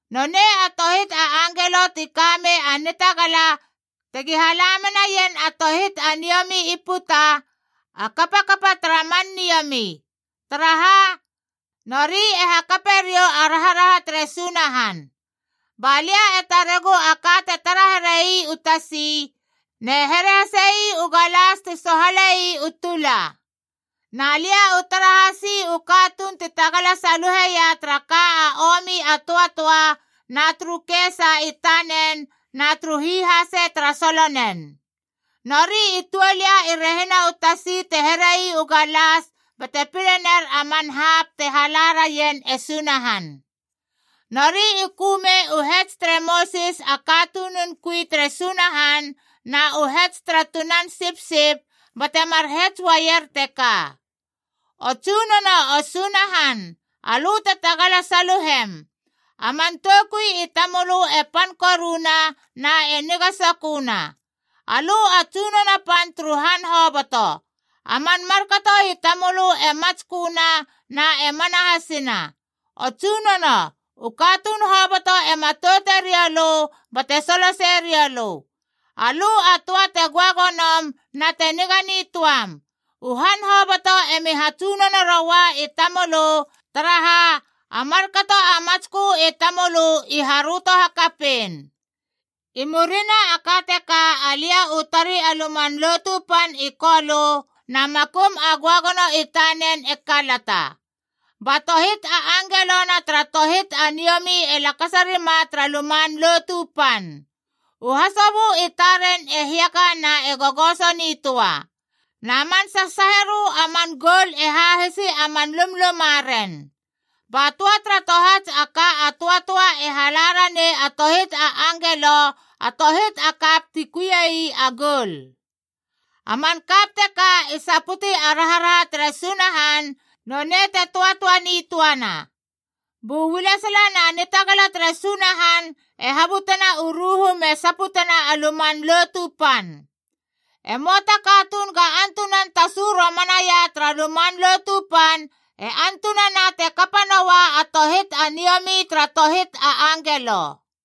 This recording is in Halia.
nonei a tohit a angelo ti ka mei a nitagala tegi hala menaien a tohit a niomi i puta, a kapakapa tara man niomi. Taraha, nori e hakape riou a raharaha tere Sunahan. Ba lia e taregu a ka te tara here ii u tasi, ne here hase ii u galas ti sohale ii u tula. Na lia u tara hasi u katuun ti tagala saluheia tara ka a omi a töatöa na turu kesa i tanen na turu hihase tara solonen.b Nori i tuol ia i rehina u tasi te here ii u galas bate pile ner a man hapc te hala raien e Sunahan. Nori i kömei u hets tere Mosis a katunun kui tere Sunahan na u hets tara Tunan Sipsip,d bate mar hets uaier teka: “O Tsunono, o Sunahan, alö te tagala saluhem! A man toukui i tamölö e pan koruna na e niga soköna. Alö a Tsunono Pan turu han hoboto. A man markato i tamölö e matsköna na e mana hasina. O Tsunono, u katuun hoboto e matoute rioulö bate soloseie riou lö. Alö a töa te göagonom na te niga nitöam. U han hoboto emi hatsunono roua i tamölö, taraha a markato a matskö i tamölö i haröto hakapein.” I murina a ka teka alia u tari a Luman Lotu Pan i Kolö na makum a göagono i tanen e kalata. Ba tohit a angelona tara tohit a niomi e lakasa rima tara Luman Lotu Pan. U hasobö i taren e hiaka na e gogoso nitöa. Na man sasaaherö a man goul e hahisi a man lumlumaren. Ba töa tara tohats a ka a töatöae e hala ranei a tohit a angelo a tohit a kap ti kuiei a goul. A man kap teka i saputi a raharaha tere Sunahan, nonei te töatöa nitöana. Bu ualesala na nitagala tere Sunahan e habutena u ruhu me saputena a Luman Lotu Pan. E möa ta katuun ga antunan tasu romanaia tara Luman Lotu Pan e antunana te kapa noa a tohit a niomi tara tohit a angelo.